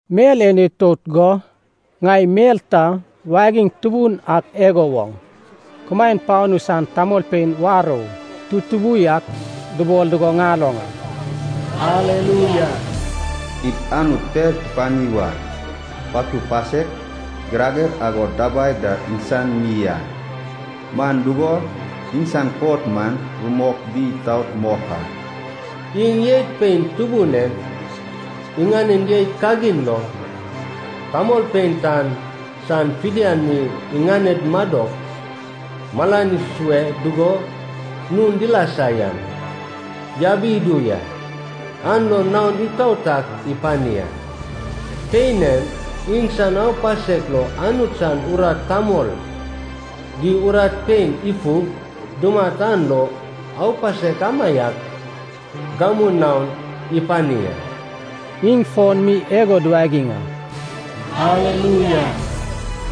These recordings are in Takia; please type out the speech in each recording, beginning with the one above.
Mel en itout go, ŋai mel ta wagiŋ tubun ak igo woŋ kumaen panu san tamolpein warou tutubu yak dubol dugo ŋaloŋ a. “Aleluia, id Anut per tupani wa! Patud pasek, girager agod dabai da iŋsan mi a. Man dugo, iŋsan kot man rumok di itaot mok a. Iŋ jeit pein tubun en, iŋanen jeit kagin lo, tamolpein tan san fidian mi iŋaned madok malan isue dugo nun dilasa yan, yabi idu ya. An lo naon itaot ak ipani a. Pein en iŋsan aupasek lo Anut san urat tamol di urat pein ifug dumat an lo aupasek amaiak gamu naon ipani a.” Iŋ fon mi igo duwagiŋ a. “Aleluia!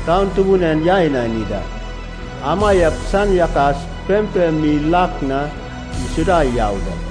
Taun tubun en yai inani da, amaiak san yakas pempem mi lak na isuda yau da.”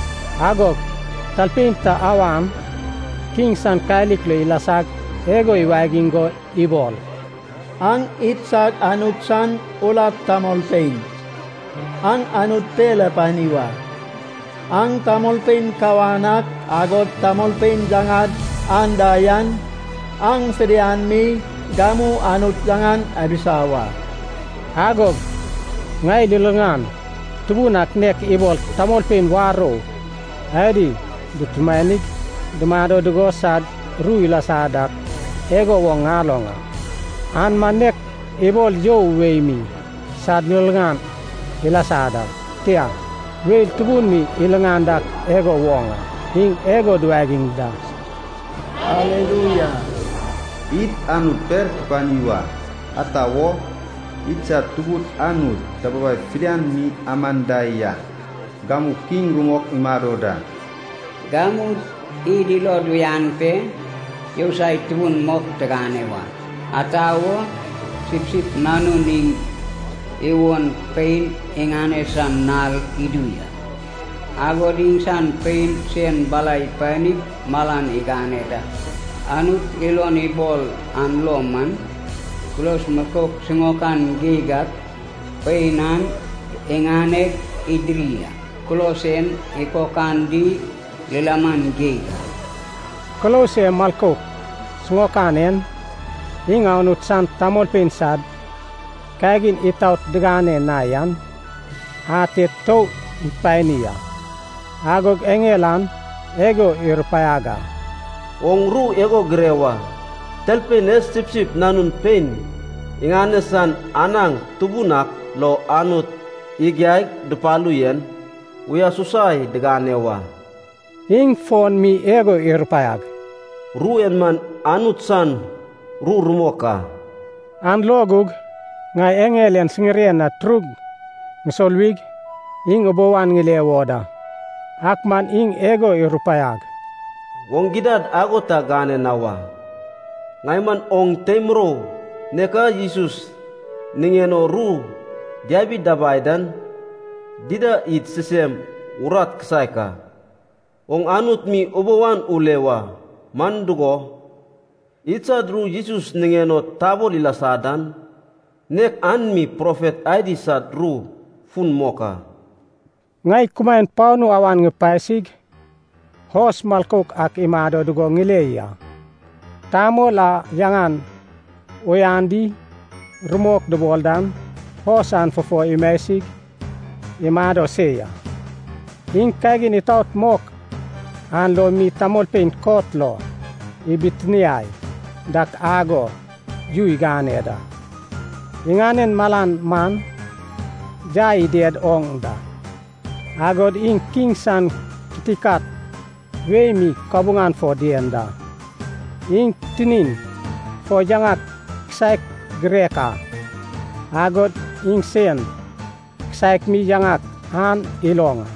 Agog talpein ta awan kiŋ san kalik lo ilasag igo iwagiŋ go ibol, “Aŋ idsad Anut san urat tamolpein, aŋ Anut per apani wa. Aŋ tamolpein kawan ak, agod tamolpein yaŋad anda yan, aŋ fidian mi gamu Anut yaŋan abisa wa!” Agog ŋai liliŋan tubun ak nek ibol tamolpein warou adi dutumanig dumado dugo sad ru ilasa dak igo woŋ ŋaloŋ a. An man nek ibol you wei mi sad liliŋan ilasa da, tia, weil tubun mi iliŋan dak igo woŋ a. Iŋ igo duwagiŋ da, “Aleluia, id Anut per tupani wa. Ata wo, idsad Tubud Anut dababai fidian mi aman da yak, gamu kiŋ rumok imado da. Gamu id ilod uyan pe yousai tubun mok tigane wa. Ata wo, Sipsip Nanun iŋ iwon pein iŋane san nal idu ya, agod iŋsan pein sen bala ipanig malan igane da. Anut ilon ibol an lo man, kulos milkouk siŋaokan geig ak pein an iŋaneg idiri a. Kulos en ikokan di lilaman geig a.” (Kulos e milkouk siŋaokan en, iŋ Anut san tamolpein sad kagin itaot digane na yan ate tou ipani a.) Agog eŋel an igo irupaiag a, “Oŋ ru igo gire wa. Talpein e Sipsip Nanun pein iŋane san anaŋ tubun ak lo Anut igiaig dupalu yen, uyasusai digane wa.” Iŋ fon mi igo irupaiag, “Ru en man Anut san ru rumok a.” An lo gug ŋai eŋel en siŋiren na turug ŋusoluwig iŋ ubou an ŋile wo da. Ak man iŋ igo irupaiag, “Oŋ gidad ago ta gane na wa. Ŋai man oŋ tei murou nek a Jesus niŋen o ru diabi dabai dan dida, id sisem urat kisaek a. Oŋ Anut mi ubou an ule wa! Man dugo, idsad ru Jesus niŋen o tabol ilasa dan, nek an mi profet adi sad ru fun mok a.” Ŋai kumaen panu awan ipasig, hos milkouk ak imado dugo ŋile ya. Tamol a yaŋan Uyan di Rumok dubol dan hos an fufo imasig imado se ya. Iŋ kagin itaot mok an lo mi tamolpein kot lo ibitiniai dak agod yu igane da. Iŋanen malan man yai ided oŋ da, agod iŋ kiŋ san kitikat wei mi kabuŋan fo dien da. Iŋ tinin fo yaŋak kisaek girek a, agod iŋsen kisaek mi yaŋak an iloŋ a,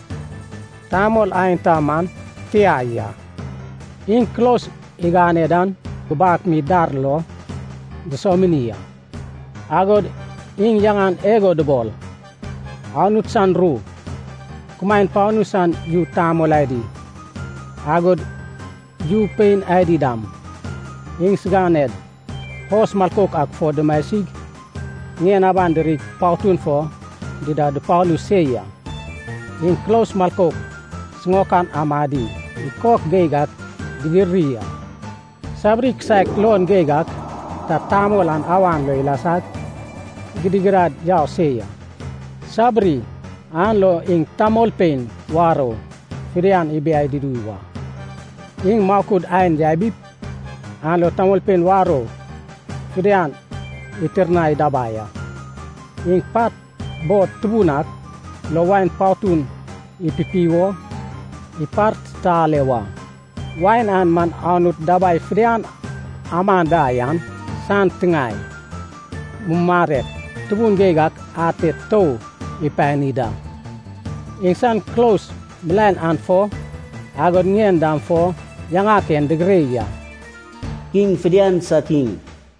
tamol aenta man tia ya. Iŋ kulos igane dan gubak mi dar lo dusomini a. Agod iŋ yaŋan igo dubol, Anut san Ru. Kumaen panu san yu tamol adi, agod yu pein adi dam, iŋsiganed hos milkouk ak fo dumasig ŋien aban dirig patun fo dida dupalu se ya. Iŋ kulos milkouk sisiŋaok amadi ikok geig ak didiri a. Sabiri kisaek luon geig ak ta tamol an awan lo ilasag gidigidad yau se ya. Sabiri an lo iŋ tamolpein warou fidian ibiai dudu wa. Iŋ makud ain yabip, an lo tamolpein warou fidian itirnai dabai a. Iŋ pat bod tubun ak lo wain patun ipipi wo ipartitale wa. Wain an man Anut dabai fidian aman da yan san tiŋae mumarek tubun geig ak ate tou ipani da. Iŋsan kulos milaen an fo, agod ŋien dam fo yaŋak en digire ya. Kiŋ fidian sad Kiŋ,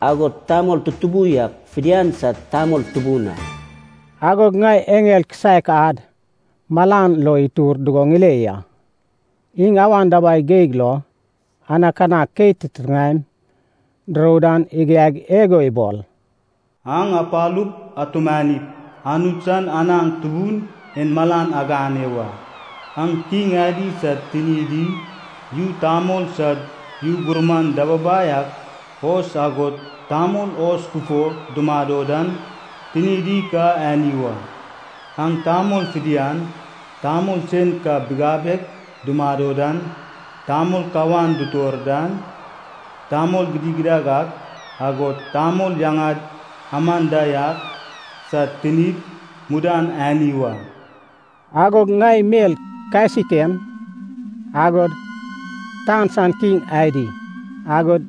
agod tamol tutubu yak fidian sad Tamol Tubun a. Agog ŋai eŋel kisaek ad malan lo itur dugo ŋile ya. Iŋ awan dabai geig lo anakanak keit titiŋaem durou dan igiaig igo ibol, “Aŋ apalup atumanip, Anut san anaŋ tubun en malan agane wa. Aŋ kiŋ adi sad tinidi, yu tamol sad yu gurman dababai ak, hos agod tamol hos fufo dumado dan, tinidi ka ani wa. Aŋ tamol fidian, tamol sen ka bigabeg dumado dan, tamol kawan dutor dan, tamol gidigidad ak, agod tamol yaŋad aman da yak, sad tinid mudan ani wa.” Agog ŋai mel kasik en, agod tan san kiŋ adi agod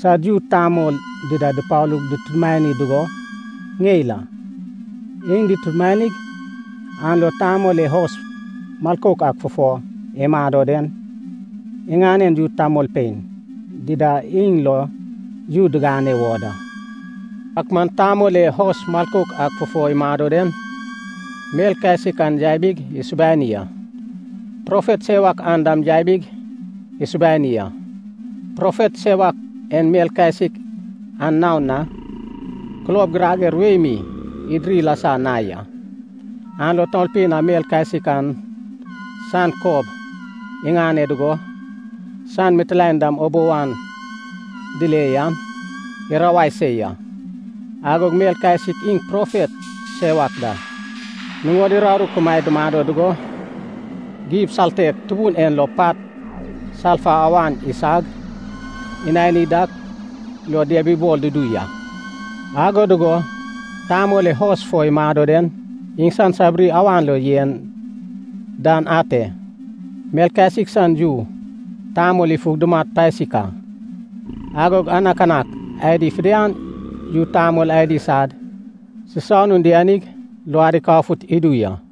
sad yu tamol dida dupalug dutumani dugo ŋeil a. Iŋ dutumanig an lo Tamol e hos milkouk ak fufo imado den, iŋanen yu tamolpein dida iŋ lo yu digane wo da. Ak man Tamol e hos milkouk ak fufo imado den, mel kasik an yabig isubani a. Profet sewak an dam yabig isubani a. Profet sewak en mel kasik an naon na kulob girager wei mi idiri ilasa na ya, an lo tamolpein a mel kasik an san kob iŋane dugo, san mitilaen dam ubou an dile yan, irawai se ya. Agog mel kasik iŋ profet sewak da, nuŋod uraru kumaed dumado dugo, gib saltek tubun en lo pat salfa awan isag, inani dak lo diabibol dudu ya. Ago dugo Tamol e hos fo imado den, iŋsan sabiri awan lo yen dan ate, mel kasik san yu tamol ifug dumat pasik a. Agog anakanak adi fidian yu tamol adi sad sisanun dianig, luad ikafut idu ya.